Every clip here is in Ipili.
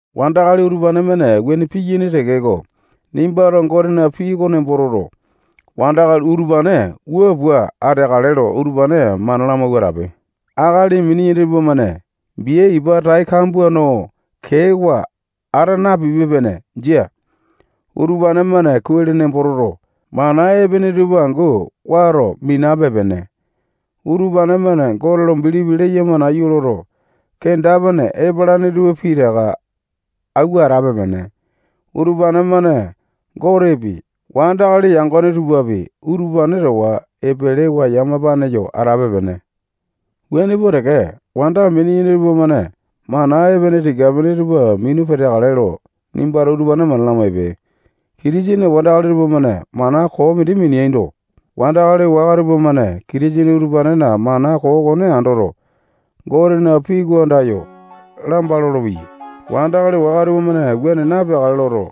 Wandakali utupane-mane wuane piyaini tekeko, nimbato Gotena pii oko nembo toto, wandakali utupane wua pua ateakale lo utupane mana lamawua atape. Akali mini-yene tupamane bia ipa tai kambua no keewa ata napipe-pene. Jia. Utupane-mane kuai lo nembo toto, mana epene tupa angu wato minape-pene. Utupane-mane Gote lo bilipi leyama nayu loto, kenda-pene epalane tupa pitaka awua atape-pene. Utupane-mane Gotepi, wandakali yangone tupapi, utupane towa epelewa yamapane yo atape-pene. Wuane pua teke, wanda mini-yene tupamane mana epene tika-pene tupa minu peteakale lo nimbato utupane mana lamaipe. Kitisene wandakali tupamane mana koo mindi mineaindo, wandakali waka tupamane Kitisene utupanena mana koo okone andoto, Gotena pii oko andayo lamba lolopeyai. Wandakali waka tupamane wuane napeakale loto,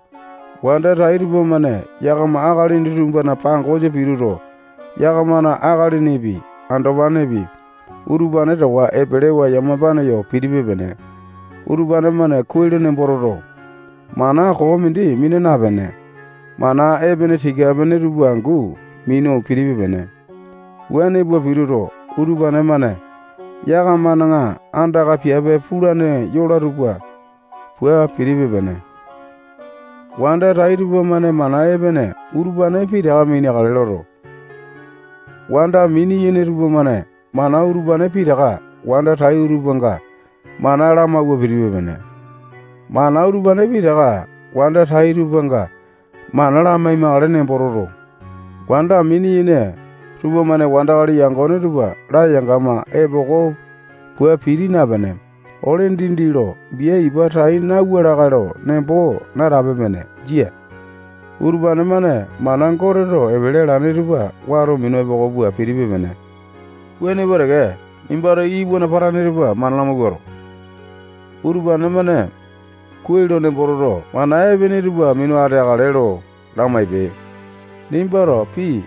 wanda tai tupamane yakama akalini tupana pangosa pituto, yakamana akalinipi, andopanepi, utupane towa epelewa yamapane yo pitipe-pene. Utupane-mane kuai lo nembo toto, mana koo mindi mina napene, mana epene tika-pene tupa angu minu pitipe-pene. Wuane pua pituto, utupane-mane yakamana andaka piape pulane yola tupa pua pitipe-pene. Wanda tai tupamane mana epene utupane pitaka mineakale loto, wanda mini-yene tupamane mana utupane pitaka wanda tai tupanga mana lamawua pitipe-pene. Mana utupane pitaka wanda tai tupanga mana lamai-makale nembo toto, wanda mini-yene tupamane wandakali yangone tupa layangama epoko pua piti napene, ole dindi lo bia ipa tai nauwa lakae lo nembo natape-pene. Jia. Utupane-mane mana Goteto epele alane tupa wato minu epoko pua pitipe-pene. Wuane pua teke, nimbato iwana patane tupa mana lamawuato, utupane-mane kuai lo nembo toto, mana epene tupa minu ateakale lo lamaipe. Nimbato pii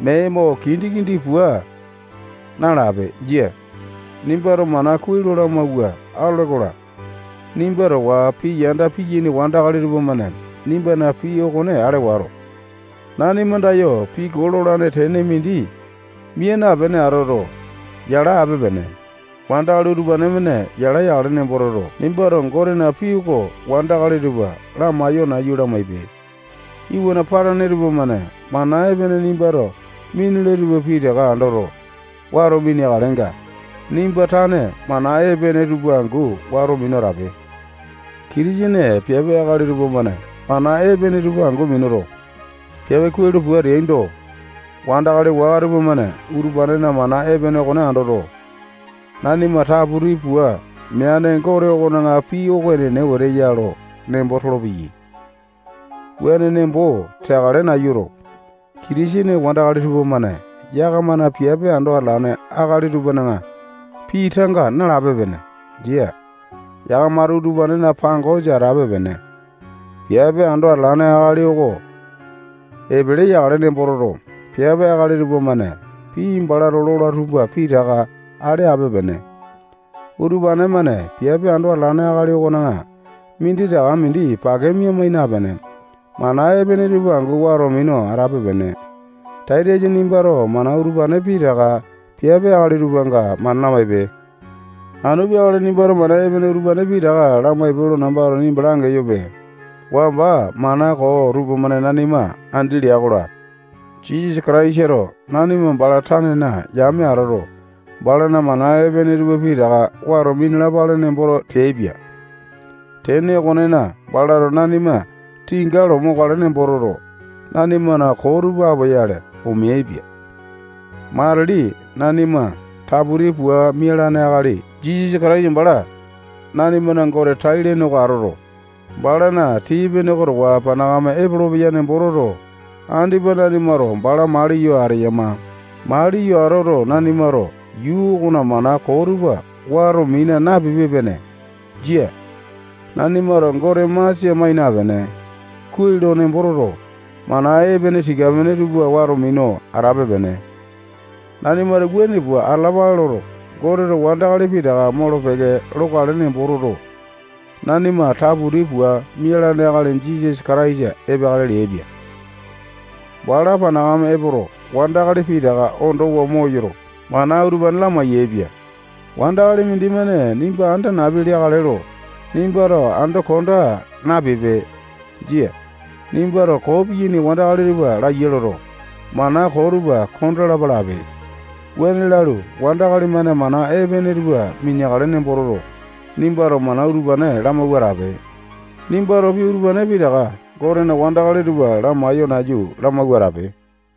mee mo kindi-kindi pua nalape. Jia. Nimbato mana kuai lo lamawua atole-kola, nimba towa pii yanda piyaini wandakali tupamane nimbana pii okone ale wato, nanima andayo pii koo lolane tene mindi mia napene atoto, yala ape-pene. Wandakali utupane-mane yala yakale nembo toto, nimbato Gotena pii oko wandakali tupa lamaiyo nayu lamaipe. Iwana patane tupamane mana epene nimbato minule tupa pitaka andoto, wato mineakalenga, nimba tane mana epene tupa angu wato minu atape. Kitisene piape akali tupamane mana epene tupa angu minuto, piape kuai lo pua ateaindo, wandakali waka tupamane utupanena mana epene okone andoto, nanima taputi pua meane Gote okona pii oko epene wete ya lo nembo tolopeyai. Wuane nembo teakale nayuto, Kitisene wandakali tupamane yakamana piape ando atalane akali tupana pii tanga nalape-pene. Jia. Yakamato utupanena pangosa atape-pene. Piape ando atalane akali oko epele yakale nembo toto, piape akali tupamane pii balato lola tupa pitaka ale ape-pene. Utupane-mane piape ando atalane akali okona minditaka mindi pake mia napene, mana epene tupa angu wato minu atape-pene. Taitasa nimbato mana utupane pitaka piape akali tupanga mana lamaipe. Anu peakale nimbato mana epene utupane pitaka lamaipe lo nambato nimba langeyope. Wamba mana koo tupamane nanima andi leai-kola, Jisasa Kataisato nanima bala tanena yame atoto, balana mana epene tupa pitaka wato minalapale nembo teaipia. Tene okonena, balato nanima tinga lo mokale nembo toto, nanimana koo tupa apoyale, omeaipia. Matili nanima taputi pua mialane akali Jisasa Kataisa bala nanimana Gote tai-lene oko atoto, balana tii-pene oko towa panakame epolopeya nembo toto, andipa nanimato bala maliyo ateyama. Maliyo atoto, nanimato yuu okona mana koo tupa wato mina napipe-pene. Jia. Nanimato Gote masia mai napene, kuai lo nembo toto, mana epene tika-pene tupa wato minu atape-pene. Nanimato wuane pua atalapale loto, Goteto wandakali pitaka molo-peke lokale nembo toto, nanima taputi pua mialane akali Jisasa Kataisa epeakale leaipia. Bala panakame epoto, wandakali pitaka ondowa moyoto, mana utupane lamai-yaepia. Wandakali mindimane nimba anda napi leakale lo nimbato ando konda napipe. Jia. Nimbato koo piyaini wandakali tupa laya loto, mana koo tupa kondalapa lape. Wuane lalu, wandakali-mane mana epene tupa mineakale nembo toto, nimbato mana utupane lamawua atape. Nimbato pii utupane pitaka Gotena wandakali tupa lamaiyo nayu lamawua atape.